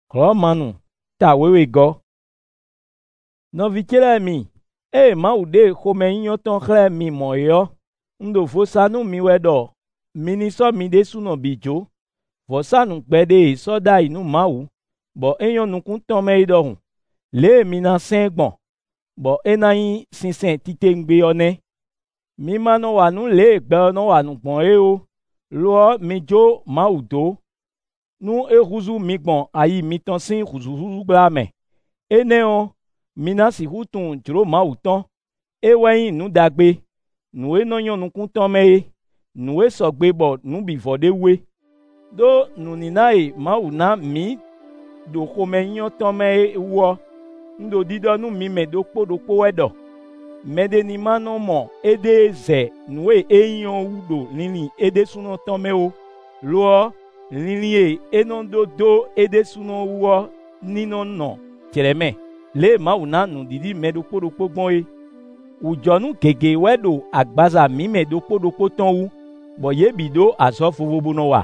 Nɛ̌ mǐ ná zán gbɛ mǐtɔn gbɔn, bó ná sixú wa azɔ̌ nú Mawu? Nɔví ce lɛ́ɛ mi, ée Mawu ɖe xomɛnyínyɔ́ tɔn xlɛ́ mi mɔ̌ é ɔ́, un ɖo vo sa nú mi wɛ ɖɔ mi ní sɔ́ mi ɖésúnɔ bǐ jǒ, vɔ̌sánú gbɛɖe e è sɔ́ ɖ'ayǐ nú Mawu, bɔ é nyɔ́ nukún tɔn mɛ é ɖɔhun. Lě e mi ná sɛn ɛ gbɔn, bɔ é ná nyí sinsɛn titewungbe ɔ́ é nɛ́. Mi ma nɔ wa nǔ lě e gbɛ ɔ́ nɔ wa nǔ gbɔn é ó; lo ɔ́, mi jó Mawu dó, nú é húzú mi gbɔn ayi mitɔn sín hǔzúhúzú gbla mɛ. Énɛ́ ɔ́, mi ná sixú tunwun jlǒ Mawu tɔn: é wɛ nyí nǔ ɖagbe; nǔ e nɔ nyɔ́ nukún tɔn mɛ é; nǔ e sɔgbe bɔ nǔ bǐ vɔ ɖ'é wú é. Đó nǔníná e Mawu ná mǐ ɖo xomɛnyínyɔ́ tɔn mɛ é wú ɔ́, un ɖo ɖiɖɔ nú mi mɛ ɖokpó ɖokpó wɛ ɖɔ mɛɖé ní ma nɔ mɔ éɖée zɛ nǔ e é nyí ɔ́ wú ɖo linlin é ɖésúnɔ tɔn mɛ ó; lo ɔ́, linlin e é nɔ ɖó dó é ɖésúnɔ wú ɔ́ ní nɔ́ nɔ jlɛ̌mɛ, lě e Mawu ná nǔɖiɖi mɛ ɖokpó ɖokpó gbɔn é. Wǔjɔnú gěgé wɛ ɖo agbaza mǐ mɛ ɖokpó ɖokpó tɔn wú, bɔ yě bǐ ɖó azɔ̌ vovo bó nɔ wa.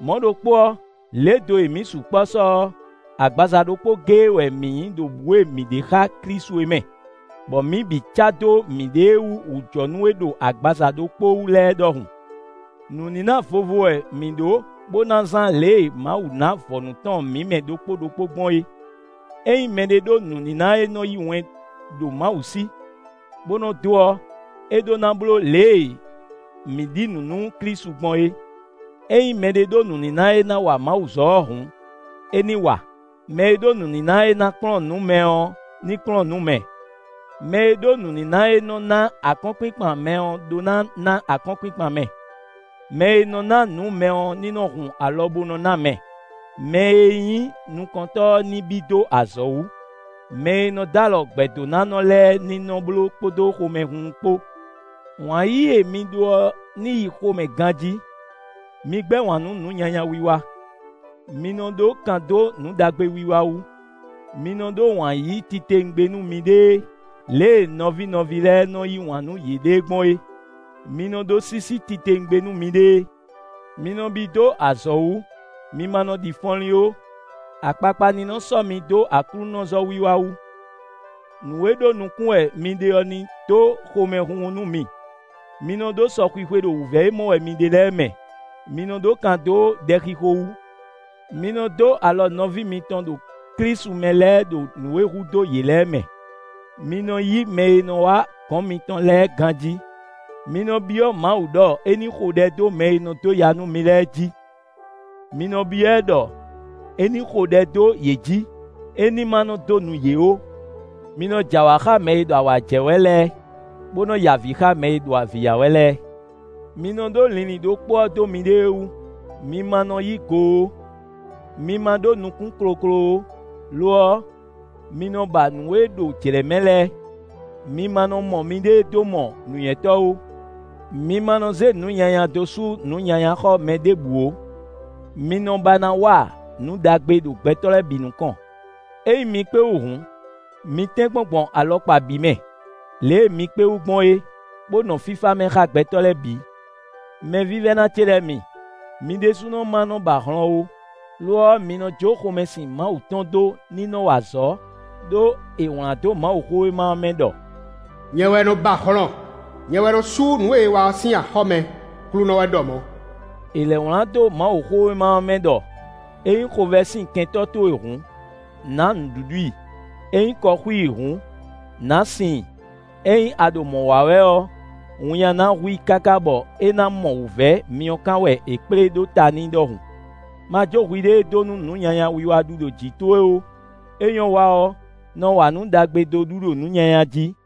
Mɔ̌ ɖokpó ɔ́, lě do e mǐ sukpɔ́ sɔ́ ɔ́, agbaza ɖokpó géé wɛ mǐ nyí ɖo bǔ e mǐ ɖe xá Klísu é mɛ, bɔ mǐ bǐ cá dó miɖée wú wǔjɔnú e ɖo agbaza ɖokpó wú lɛ́ɛ ɖɔhun. Nǔníná vovo wɛ mǐ ɖó bó ná zán lě e Mawu ná vɔ̌nu tɔn mǐ mɛ ɖokpó ɖokpó gbɔn é. Ényí mɛɖé ɖó nǔníná e nɔ yí wɛn ɖo Mawu sí, bó nɔ dó ɔ́, é ɖó ná bló lě e mǐ ɖi nǔ nú Klísu gbɔn é. Ényí mɛɖé ɖó nǔníná e ná wa Mawuzɔ́ ɔ́ hǔn, é ní wa. Mɛ e ɖó nǔníná e ná kplɔ́n nǔ mɛ ɔ́, ní kplɔ́n nǔ mɛ. Mɛ e ɖó nǔníná e nɔ́ ná akɔ́nkpinkpan mɛ ɔ́ ɖó ná ná akɔ́nkpinkpan mɛ. Mɛ e nɔ ná nǔ mɛ ɔ́ ní nɔ hun alɔ bo nɔ ná mɛ. Mɛ e nyí nukɔntɔ́ ɔ́ ní bí dó azɔ̌ wú. Mɛ e nɔ d'alɔ gbɛ̌dónánɔ lɛ́ɛ ní nɔ́ bló kpódó xomɛhunhun kpó. Wǎn yíyí e mi ɖó ɔ́ ní yi xomɛ ganjí. Mi gbɛ́ wǎn nú nǔ nyanya wiwa. Mi nɔ ɖó kan dó nǔ ɖagbe wiwa wú. Mi nɔ ɖó wǎn yíyí titewungbe nú miɖée lě e nɔví nɔví lɛ́ɛ nɔ́ yí wǎn nú yěɖée gbɔn é. Mi nɔ ɖó sísí titewungbe nú miɖée. Mi nɔ bí dó azɔ̌ wú; mi ma nɔ ɖi fɔnlín ó. Akpakpa ní nɔ́ sɔ́ mi dó aklúnɔzɔ́ wiwa wú. Nǔ e ɖó nukún wɛ mi ɖe ɔ́ ní dó xomɛhunhun nú mi. Mi nɔ ɖó sɔxwixwe ɖo wǔvɛ́ e mɔ wɛ mi ɖe lɛ́ɛ mɛ. Mi nɔ ɖó kan dó ɖɛxixo wú. Mi nɔ dó alɔ nɔví mitɔn ɖo Klísu mɛ lɛ́ɛ ɖo nǔ e hudó yě lɛ́ɛ mɛ. Mi nɔ yí mɛ e nɔ wá gɔ̌n mitɔn lɛ́ɛ ganjí. Mi nɔ byɔ́ Mawu ɖɔ é ní xo ɖɛ dó mɛ e nɔ dó ya nú mi lɛ́ɛ jí. Mi nɔ byɔ́ ɛ ɖɔ é ní xo ɖɛ dó yě jǐ; é ní ma nɔ́ dó nu yě ó. Mi nɔ jɛ awǎ xá mɛ e ɖo awǎ jɛ wɛ lɛ́ɛ, bó nɔ́ ya avǐ xá mɛ e ɖo avǐ ya wɛ lɛ́ɛ. Mi nɔ ɖó linlin ɖokpó ɔ́ dó miɖée wú. Mi ma nɔ yí go ó; mi ma ɖó nukún kloklo ó; lo ɔ́, mi nɔ ba nǔ e ɖo jlɛ̌ mɛ lɛ́ɛ. Mi ma nɔ́ mɔ miɖée dó mɔ nǔnywɛ́tɔ́ ó. Mi ma nɔ zé nǔ nyanya dó sú nǔ nyanya xɔ́ mɛ ɖěbǔ ó; mi nɔ ba ná wa nǔ ɖagbe ɖo gbɛtɔ́ lɛ́ɛ bǐ nukɔn. Ényí mi kpé wú hǔn, mi tɛ́nkpɔ́n gbɔn alɔkpa bǐ mɛ lě e mi kpé wú gbɔn é, bó nɔ fífá mɛ xá gbɛtɔ́ lɛ́ɛ bǐ. Mɛvívɛ́ná ce lɛ́ɛ mi, mi ɖésúnɔ ma nɔ ba hlɔn ó; lo ɔ́, mi nɔ jó xomɛsin Mawu tɔn dó ní nɔ́ wa azɔ̌, ɖó è wlǎn dó Mawuxówéma ɔ́ mɛ ɖɔ: “Nyɛ wɛ nɔ ba hlɔn; nyɛ wɛ nɔ sú nǔ e è wa ɔ́ sín axɔ́ mɛ; Aklúnɔ wɛ ɖɔ mɔ̌.” È lɛ̌ wlán dó Mawuxówéma ɔ́ mɛ ɖɔ: “Ényí xovɛ́ sin kɛntɔ́ towe hǔn, nǎ nǔɖuɖu i; ényí kɔ xú i hǔn, nǎ sin i. Ényí a ɖo mɔ̌ wa wɛ ɔ́, winnyá ná hu i káká bɔ é ná mɔ wǔvɛ́ myɔkán wɛ è kplé ɖó ta n'i ɖɔhun.” Ma jó hwiɖée dó nú nǔ nyanya wiwa ɖu ɖo jǐ towe ó; é nyɔ́ wa ɔ́, nɔ wa nǔ ɖagbe dó ɖu ɖo nǔ nyanya jí.